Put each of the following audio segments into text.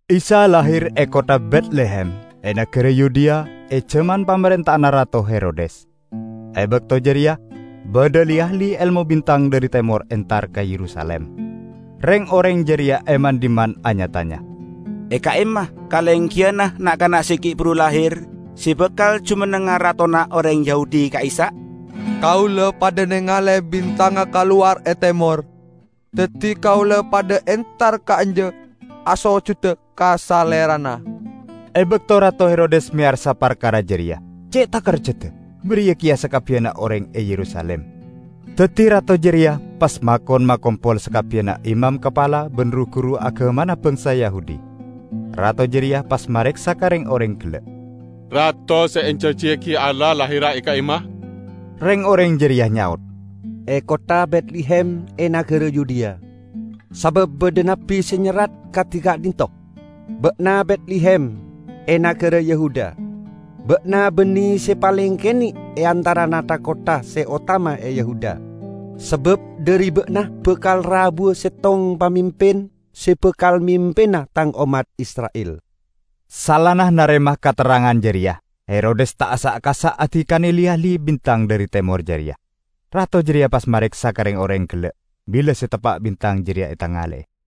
Isa lahir e kottha Betlehem e nagara Yudea e jaman pamarenta'anna Rato Herodes. E bakto jareya badha li-ahli elmo bintang dhari Temor entar ka Yerusalim. Reng-oreng jareya e man-dhimman anya-tanya, "E ka'imma kalenggiyanna na'-kana' se gi' buru lahir se bakal jumennengnga ratona oreng Yahudi ka'issa'? Kaula padha nengale bintangnga kalowar e temor, daddi kaula padha entar ka'anja asojuda ka Salerana." E bakto Rato Herodes meyarsa parkara jareya, ce' takerjada, bariya keya sakabbiyanna oreng e Yerusalim. Daddi rato jareya pas makon makompol sakabbiyanna imam kapala ban ru-guru agamana bangsa Yahudi. Rato jareya pas mareksa ka reng-oreng gella', "Rato se ejanjiyagi Allah lahira e ka'imma?" Reng-oreng jareya nyaot, "E kottha Betlehem e nagara Yudea. Sabab badha nabbi se nyerrat kadi ka'dhinto', 'Ba'na Betlehem, e nagara Yehuda, ba'na banne se paleng kene' e antarana tha-kottha se otama e Yehuda. Sabab dhari ba'na bakal rabuwa settong pamimpin se bakal mimpina Tang ommat Isra'il.' " Saellana narema katerrangan jareya, Herodes ta' asa'-kasa' adikane li-ahli bintang dhari Temor jareya. Rato jareya pas mareksa ka reng-oreng gella' bila se teppa' bintang jareya etangale'e.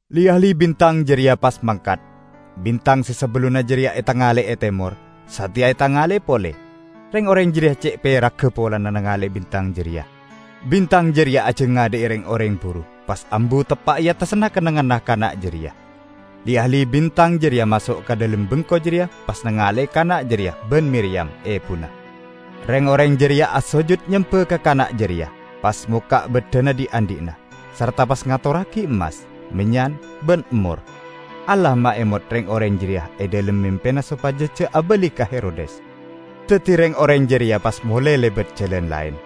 Li-ahli bintang jareya pas mangkat. Bintang se sabellunna jareya etangale'e e temor, sateya etangale'e pole. Reng-oreng jareya ce' peragga polana nangale'e bintang jareya! Bintang jareya ajangadha'i reng-oreng buru, pas ambu teppa' e attasanna kennengnganna kana' jareya. Li-ahli bintang jareya maso' ka dhalem bengko jareya pas nangale'e kana' jareya ban Miriyam, ebuna. Reng-oreng jareya asojud nyemba ka kana' jareya, pas mokka' baddhana dhi'-andhi'na, sarta pas ngatorragi emmas, mennyan ban emmor. Allah maemot reng-oreng jareya e dhalem mempena sopaja ja' abali ka Herodes. Daddi reng-oreng jareya pas mole lebat jalan laen.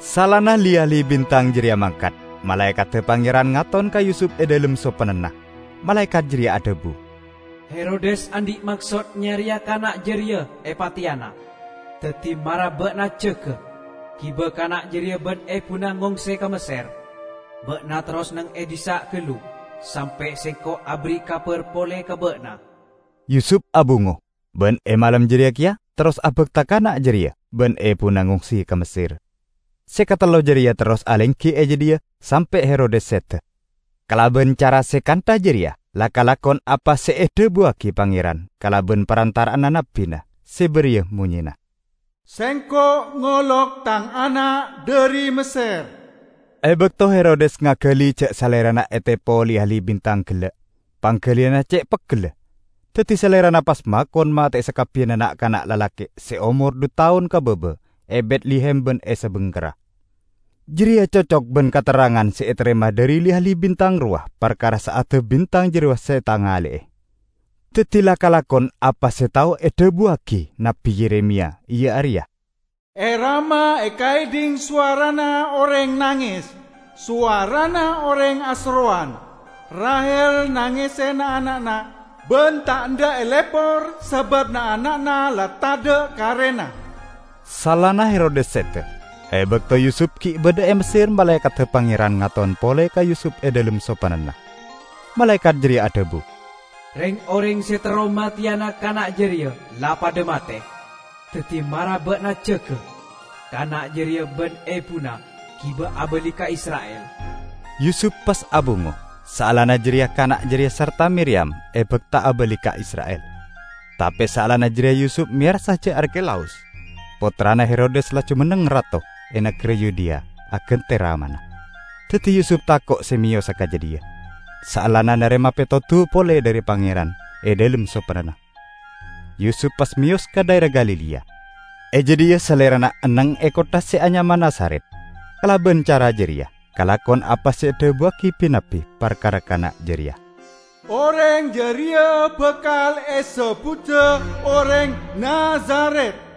Saellana li-ahli bintang jareya mangkat, malaekadda Pangeran ngaton ka Yusup e dhalem sopennana. Malaekat jareya adhabu, "Herodes andhi' maksod nyareya kana' jareya epateyana. Daddi mara ba'na jaga, giba kana' jareya ban ebuna ngongse ka Messer. Ba'na terros neng e dhissa' gallu sampe' sengko' aberri' kabar pole ka ba'na." Yusup abungo, ban e malem jareya keya terros abakta kana' jareya ban ebuna ngongse ka Messer. Se katello jareya terros alenggi e jadhiya sampe' Herodes seda. Kalaban cara se kantha jareya la kalakon apa se edhabuwagi Pangeran kalaban parantara'anna nabbina, se bariya monyena, "Sengko' ngolok Tang Ana' dhari Messer." E bakto Herodes ngagali ja' salerana etepo li-ahli bintang gella', panggaliyanna ce' peggella. Daddi salerana pas makon mate'e sakabbiyanna na'-kana' lalake' se aomor dhu taon ka baba e Betlehem ban e sabingkerra. Jareya cocok ban katerrangan se etarema dhari li-ahli bintang rowa parkara sa'adda bintang jarowa se etangale'e. Daddi la kalakon apa se tao edhabuwagi Nabbi Yeremiya, iya areya, "E Rama ekaedhing sowarana oreng nanges, sowarana oreng aserrowan. Rahel nangese na'-ana'na; ban ta' endha' elepor sabab na'-ana'na la tadha' karena." Saellana Herodes seda, e bakto Yusup gi' badha e Messer malaekadda Pangeran ngaton pole ka Yusup e dhalem sopennana. Malaekat jareya adhabu, "Reng-oreng se terro mateyana kana' jareya la padha mate. Daddi mara ba'na jaga, kana' jareya ban ebuna giba abali ka Isra'il." Yusup pas abungo, saellana jareya kana' jareya sarta Miriyam ebakta abali ka Isra'il. Tape saellana jareya Yusup meyarsa ja' Arkelaus, pottrana Herodes la jumenneng rato e nagara Yudea agante ramana. Daddi Yusup tako' se meyosa ka jadhiya. Saellana narema petodu pole dhari Pangeran e dhalem sopennana, Yusup pas meyos ka dhaera Galilea. E jadhiya salerana enneng e kottha se anyama Nazaret. Kalaban cara jareya kalakon apa se edhabuwagi bi-nabbi parkara kana' jareya: "Oreng jareya bakal esebbuda Oreng Nazaret."